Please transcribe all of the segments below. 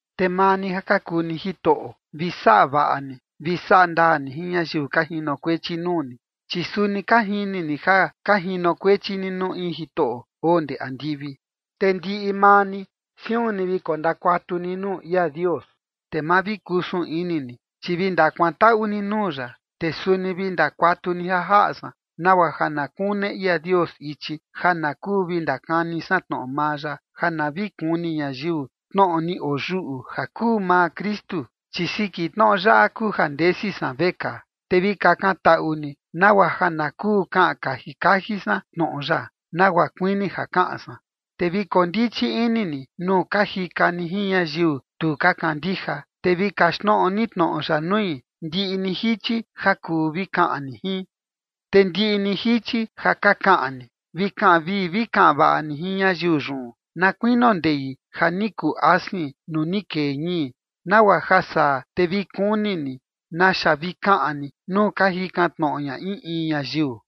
Te maa ni ja ka kuu ni jitoꞌo, vi saꞌa vaꞌa ni vi saꞌa ndaa ni jin ñayiu ka jinokuechi nuu ni, chi suni ka jini ni ja ka jinokuechi ni nuu in Jitoꞌo oo ndee andivi. Te ndiꞌi maa ni, siun ni vi kondakuatu ni nuu ia Dios, te ma vi kusun ini ni, chi vi ndakuantaꞌu ni nuu ya. Te suni vi ndakuatu ni ja jaꞌa san, nagua ja na kune ia Dios ichi ja na kuu vi ndakani san tnoꞌo maa ya, ja na vi kuni ñayiu tnoꞌo ni oyuꞌu ja kuu maa Kristu, chi siki tnoꞌo yaꞌa kuu ja ndesi san vekaa. Te vi kakantaꞌu ni nagua ja na kuu kaꞌan kaji kaji san tnoꞌo ya nagua kuini ja kaꞌan san. Te vi koo ndichi ini ni nuu ka jika ni jin ñayiu tu ka kandija, te vi kaxtnoꞌo ni tnoꞌo ya nui ndiꞌi ni jichi ja kuu vi kaꞌan ni jin. Te ndiꞌi ni jichi ja ka kaꞌan ni, vi kaꞌan vii vi kaꞌan vaꞌa ni jin ñayiu yun, na kuinio ndei ja ni kuu asin nuu ni kee ñii, nagua ja saa te vi kuni ni naxa vi kaꞌan ni nuu ka jikan tnoꞌo ña in in ñayiu.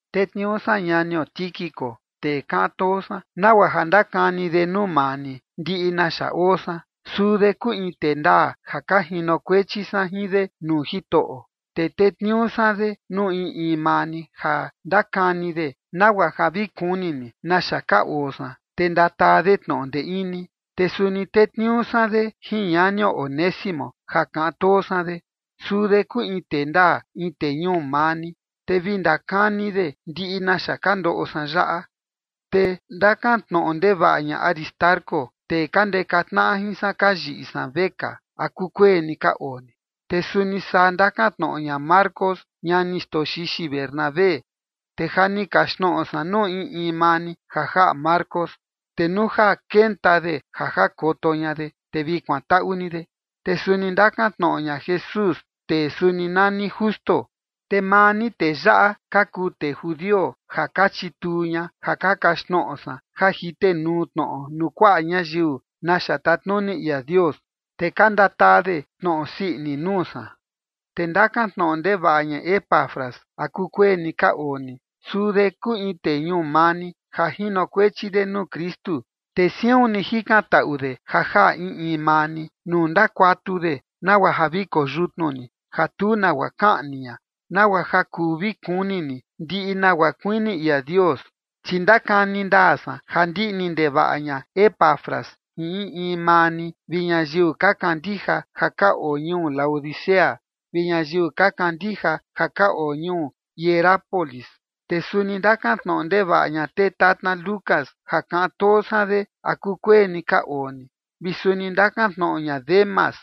Tetniuu san ñanio Tíquico, tee kaꞌan too san, nagua ja ndakani de nuu maa ni ndiꞌi naxa oo san. Suu de kuu in tee ndaa ja ka jinokuechi san jin de nuu Jitoꞌo. Te tetniuu san de nuu in in maa ni ja ndakani de nagua ja vi kuni ni naxa ka oo san, te ndataa de tnoꞌo ndee ini. Te suni tetniuu san de jin ñanio Onésimo ja kaꞌan too san de. Suu de kuu in tee ndaa, in tee ñuu maa ni, te vi ndakani de ndiꞌi naxa ka ndoꞌo san yaꞌa. Te ndakantnoꞌo ndevaꞌa ña Aristarco, tee ka ndeka tnaꞌa jin san ja ka yiꞌi san vekaa, a kukueni ka oo ni. Te suni saa ndakantnoꞌo ña Marcos ñani xtoo xixi Bernabé. Te ja ni kaxtnoꞌo san nuu in in maa ni ja jaꞌa Marcos, te nuu ja kenta de ja jakoto ña de, te vi kuantaꞌu ni de. Te suni ndakantnoꞌo ña Jesús, tee suni nani Justo, te maa ni tee yaꞌa ka kuu tee judio ja ka chituu ña ja ka kaxtnoꞌo san ja jitenuu tnoꞌo nuu kuaꞌa ñayiu naxa tatnuni ia Dios, te ka ndataa de tnoꞌo sii ini nuu san. Te ndakantnoꞌo ndevaꞌa ña Epafras a kukueni ka oo ni. Suu de kuu in tee ñuu maa ni, ja jinokuechi de nuu Kristu. Te siun ni jikantaꞌu de ja jaꞌa in in maa ni nuu ndakuatu de nagua ja vi koyutnu ni, ja tu nagua kaꞌni ña, nagua ja kuu vi kuni ni ndiꞌi nagua kuini ia Dios. Chi ndakani ndaa san ja ndiꞌni ndevaꞌa ña Epafras jin in in maa ni vi ñayiu ka kandija ja ka oo ñuu Laodicea vi ñayiu ka kandija ja ka oo ñuu Hierápolis. Te suni ndakantnoꞌo ndevaꞌa ña tee tatna Lucas ja kaꞌan too san de, a kukueni ka oo ni, vi suni ndakantnoꞌo ña Demas.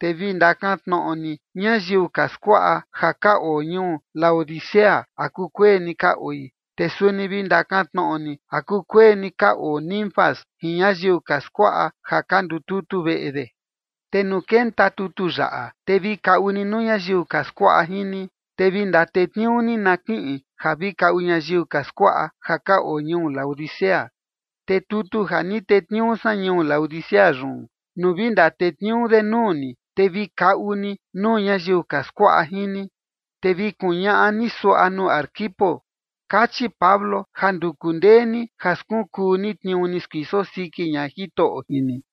Te vi ndakantnoꞌo ni ñayiu ka skuaꞌa ja ka oo ñuu Laodicea a kukueni ka oi. Te suni vi ndakantnoꞌo ni a kukueni ka oo Ninfas jin ñayiu ka skuaꞌa ja ka ndututu veꞌe de. Te nuu kenta tutu yaꞌa, te vi kaꞌu ni nuu ñayiu ka skuaꞌa jin ni, te vi ndatetniuu ni na kiꞌin ja vi kaꞌu ñayiu ka skuaꞌa ja ka oo ñuu Laodicea. Te tutu ja ni tetniuu san ñuu Laodicea yun, nuu vi ndatetniuu de nuu ni, te vi kaꞌu ni nuu ñayiu ka skuaꞌa jin ni. Te vi kuñaꞌa ni suaꞌa nuu Arquipo: “Kachi Pablo ja nduku ndee ni ja skunkuu ni tniuu ni skuiso siki ña Jitoꞌo jin ni”.